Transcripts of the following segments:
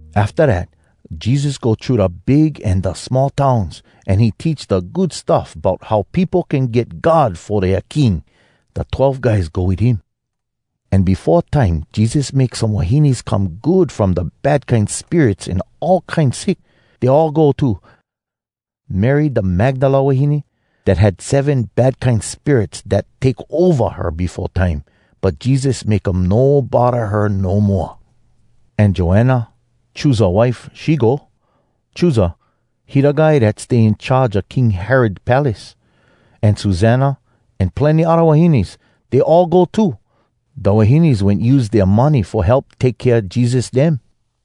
Afta dat Jesus go thru da big an da small towns, an he teach da Good Stuff bout how peopo can get God fo dea king. Da Twelve Guys go wit him. An befo time Jesus make some wahines come good from da bad kine spirits an all kine sick. Dey all go too: Mary da Magdala wahine, dat had seven bad kine spirits dat take ova her befo time, but Jesus make um no bodda her no moa. An Joanna, Chuza wife, she go. (Chuza, he da guy dat stay in charge a King Herod palace.) An Susanna, an plenny odda wahines, dey all go too. Da wahines wen use dea money fo help take kea Jesus dem.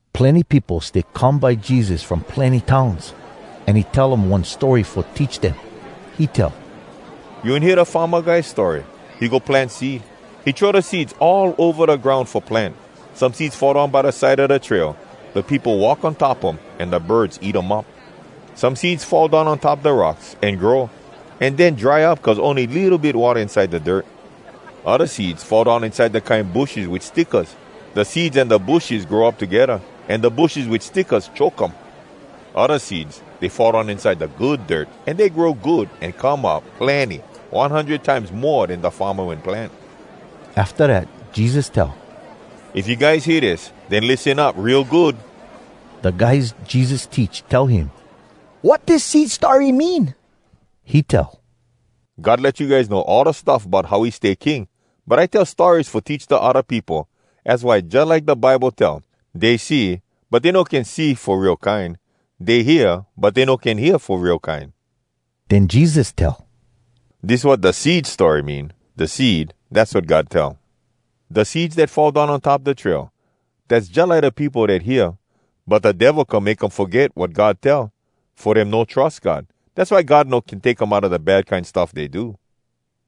Plenny peopo stay come by Jesus from plenny towns, an he tell um one story fo teach dem. He tell, “You wen hear da farma guy story? He go plant seed. He throw da seeds all ova da groun fo plant. Some seeds fall down by da side a da trail. Da peopo walk on top um, an da birds eat um up. Some seeds fall down on top da rocks, an grow, an den dry up, cuz ony litto bit watta inside da dirt. Odda seeds fall down inside da kine bushes wit stickas. Da seeds an da bushes grow up togedda, an da bushes wit stickas choke um. Odda seeds, dey fall down inside da good dirt, an dey grow good, an come up plenny, one hundred times mo den da farma wen plant.” Afta dat Jesus tell, “If you guys hear dis, den lissen up real good!” Da guys Jesus teach tell him, “Wat dis Seed story mean?” He tell, “God let you guys know all da stuff bout how he stay king. But I tell stories fo teach da odda peopo, az why jalike da Bible tell, ‘dey see, but dey no can see fo real kine. Dey hear, but dey no can hear fo real kine.’” Den Jesus tell, “Dis wat da Seed story mean. Da seed, dass wat God tell. Da seeds dat fall down on top da trail, dass jalike da peopo dat hear. But da Devil come make um foget wat God tell, fo dem no trus God. Dass why God no can take um outa da bad kine stuff dey do.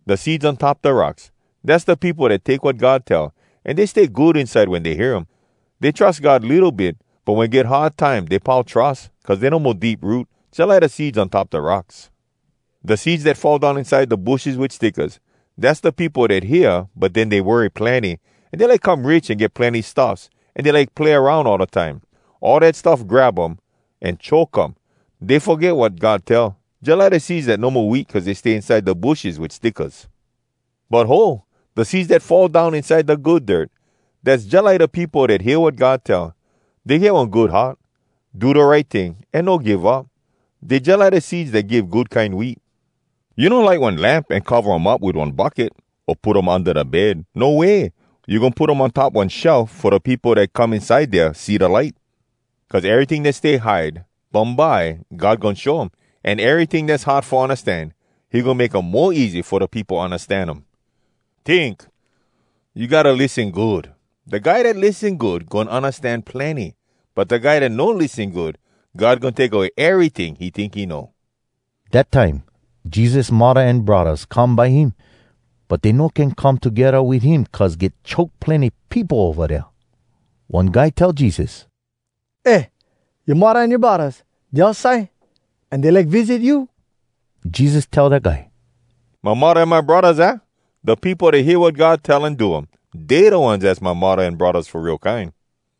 Da seeds on top da rocks, dass da peopo dat take wat God tell, an dey stay good inside wen dey hear um. Dey trus God litto bit, but wen get hard time dey pau trus, cuz dey no mo deep root, jalike da seeds on top da rocks. Da seeds dat fall down inside da bushes wit stickas, dass da peopo dat hear, but den dey worry plenny, an dey like come rich an get plenny stuffs, an dey like play aroun all da time. All dat stuff grab um, an choke um. Dey foget wat God tell, jalike da seeds dat no mo wheat cuz dey stay inside da bushes wit stickas. But ho! Da seeds dat fall down inside da good dirt, dass jalike da peopo dat hear wat God tell. Dey get one good heart, do da right ting, an no give up. Dey jalike da seeds dat give good kine wheat.” “You no light one lamp an cova um up wit one bucket, o put um unda da bed. No way! You goin put um on top one shelf fo da peopo dat come inside dea see da light. Cuz eryting dat stay hide, bumbye God goin show um, an eryting dass hard fo undastan he goin make um mo easy fo da peopo undastan um. Tink! You gotta lissen good! Da guy dat lissen good goin undastan plenny, but da guy dat no lissen good, God goin take away eryting he tink he know.” Dat time Jesus muddah an braddahs come by him, but dey no can come togedda wit him cuz get choke plenny peopo ova dea. One guy tell Jesus, “Eh, yoa muddah an yoa braddahs, dey outside, an dey like visit you.” Jesus tell da guy, “My muddah an my braddahs, aah? Da peopo dat hear wat God tell an do um, dey da ones az my muddah an braddahs fo real kine.”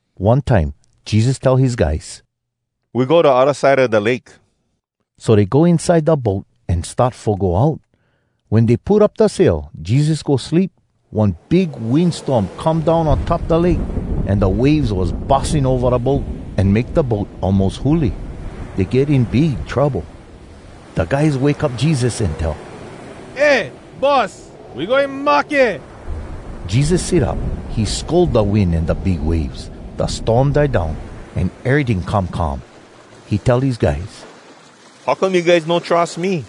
One time Jesus tell his guys, “We go da odda side a da lake.” So dey go inside da boat an start fo go out. Wen dey put up da sail, Jesus go sleep. One big wind storm come down on top da lake, an da waves was bussing ova da boat, an make da boat almos huli. Dey get in big trouble. Da guys wake up Jesus, an tell, “Eh, Boss! We goin mahke!” Jesus sit up. He scold da wind an da big waves. Da storm die down, an eryting come calm. He tell his guys, “How come you guys no trus me?”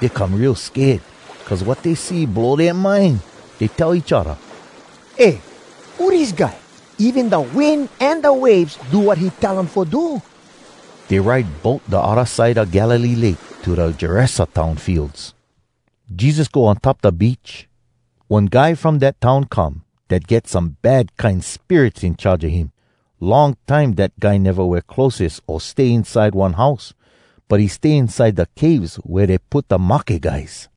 Dey come real sked, cuz wat dey see blow dea mind. Dey tell each odda, “Eh, who dis guy? Even da wind an da waves do wat he tell um fo do!” Dey ride boat da odda side a Galilee Lake to da Gerasa town fields. Jesus go on top da beach. One guy from dat town come dat get some bad kine spirits in charge a him. Long time dat guy neva wear clotheses o stay inside one house, but he stay inside da caves wea dey put da mahke guys.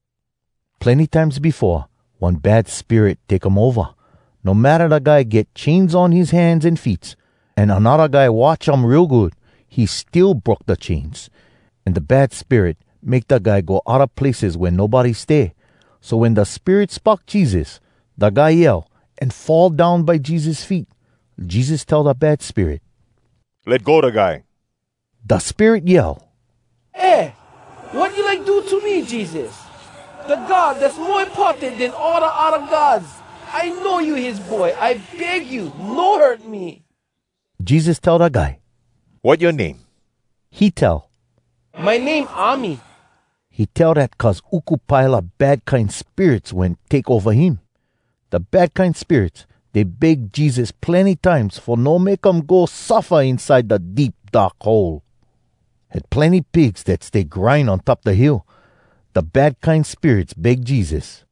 Plenny times befo, one bad spirit take um ova. No matta da guy get chains on his hands an feets, an anodda guy watch um real good, he still broke da chains. An da bad spirit make da guy go odda places wea nobody stay. So wen da spirit spock Jesus, da guy yell, an fall down by Jesus feet. Jesus tell da bad spirit, “Let go da guy!” Da spirit yell, “Eh, wat you like do to me, Jesus? Da God Dass Mo Importan Den All Da Odda Gods, I know you his Boy! I beg you, no hurt me!” Jesus tell da guy, “Wat yoa name?” He tell, “My name ‘Army.’” He tell dat cuz uku pile a bad kine spirits wen take ova him. Da bad kine spirits, dey beg Jesus plenny times fo no make um go suffa inside da Deep Dark Hole. Had plenny pigs dat stay grind on top da hill. Da bad kine spirits beg Jesus,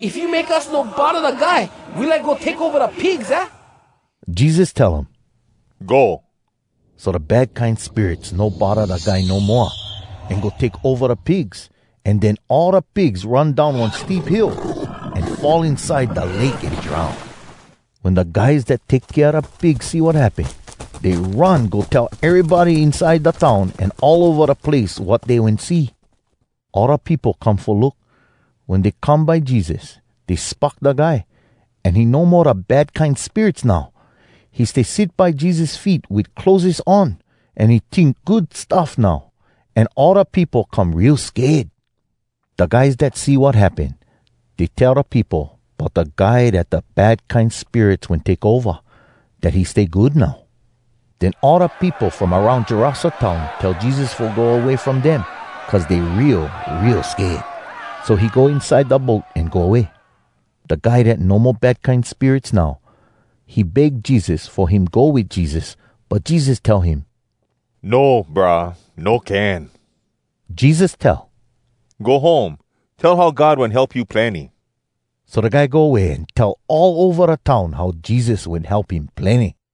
“If you make us no bodda da guy, we like go take ova da pigs, aah?” Jesus tell um, “Go!” So da bad kine spirits no bodda da guy no moa, an go take ova da pigs. An den all da pigs run down one steep hill, an fall inside da lake an drown. Wen da guys dat take kea da pigs see wat happen, dey run go tell erybody inside da town an all ova da place wat dey wen see. All da peopo come fo look. Wen dey come by Jesus, dey spock da guy, an he no mo da bad kine spirits now. He stay sit by Jesus feet wit clotheses on, an he tink good stuff now. An all da peopo come real sked. Da guys dat see wat happen, dey tell da peopo bout da guy dat da bad kine spirits wen take ova, dat he stay good now. Den all da peopo from aroun Gerasa town tell Jesus fo go way from dem, cuz dey real, real sked. So he go inside da boat an go way. Da guy dat no mo bad kine spirits now, he beg Jesus fo him go wit Jesus, but Jesus tell him, “No, brah. No can.” Jesus tell, “Go home. Tell how God wen help you plenny.” So da guy go way an tell all ova da town how Jesus wen help him plenny.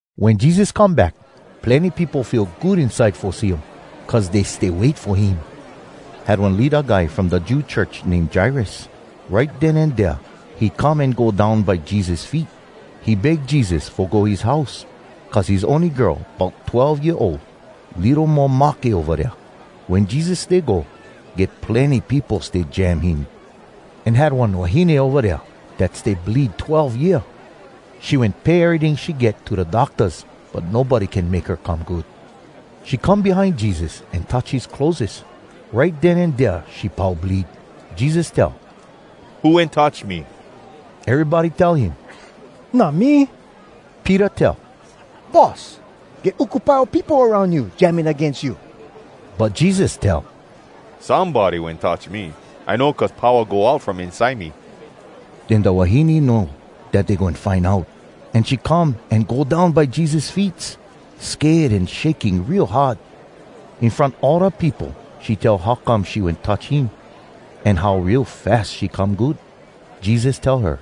Wen Jesus come back, plenny peopo feel good inside fo see um, cuz dey stay wait fo him. Had one leada guy from da Jew church, name Jairus. Right den an dea he come an go down by Jesus feet. He beg Jesus fo go his house, cuz his ony girl, bout twelve year ol, litto mo mahke ova dea. Wen Jesus stay go, get plenny peopo stay jam him. An had one wahine ova dea dat stay bleed twelve year. She wen pay eryting she get to da doctas, but nobody can make her come good. She come behind Jesus an touch his clotheses. Right den an dea she pau bleed. Jesus tell, “Who wen touch me?” Erybody tell him, “Not me!” Peter tell, “Boss, get uku pile a peopo aroun you, jamming agains you.” But Jesus tell, “Somebody wen touch me. I know, cuz powa go out from inside me.” Den da wahine know dat dey goin find out, an she come an go down by Jesus feets, sked an shaking real hard. In front all da peopo she tell how come she wen touch him, an how real fas she come good. Jesus tell her,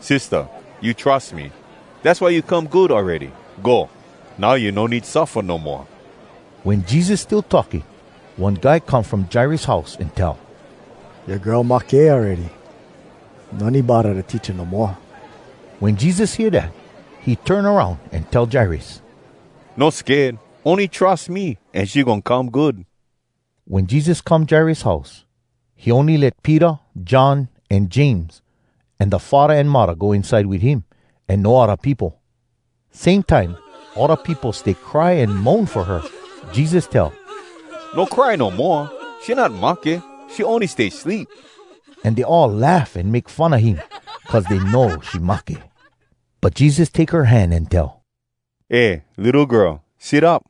“Sistah, you trus me. Dass why you come good awready. Go. Now you no need suffa no moa.” Wen Jesus still talking, one guy come from Jairus house, an tell, “Yoa girl mahke awready. No need bodda da teacha no moa.” Wen Jesus hear dat, he turn aroun an tell Jairus, “No sked, ony trus me, an she goin come good.” Wen Jesus come Jairus house, he ony let Peter, John, an James, an da faddah an muddah go inside wit him, an no odda peopo. Same time all da peopo stay cry an moan fo her. Jesus tell, “No cry no moa! She not mahke, she ony stay sleep.” An dey all laugh an make fun a him, cuz dey know she mahke. But Jesus take her hand an tell, “Eh litto girl, sit up!”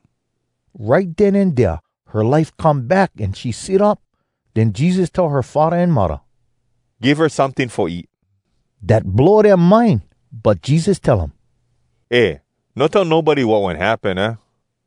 Right den an dea her life come back an she sit up. Den Jesus tell her faddah an muddah, “Give her someting fo eat.” Dat blow dea mind. But Jesus tell um, “Eh! No tell nobody wat wen happen, aah.”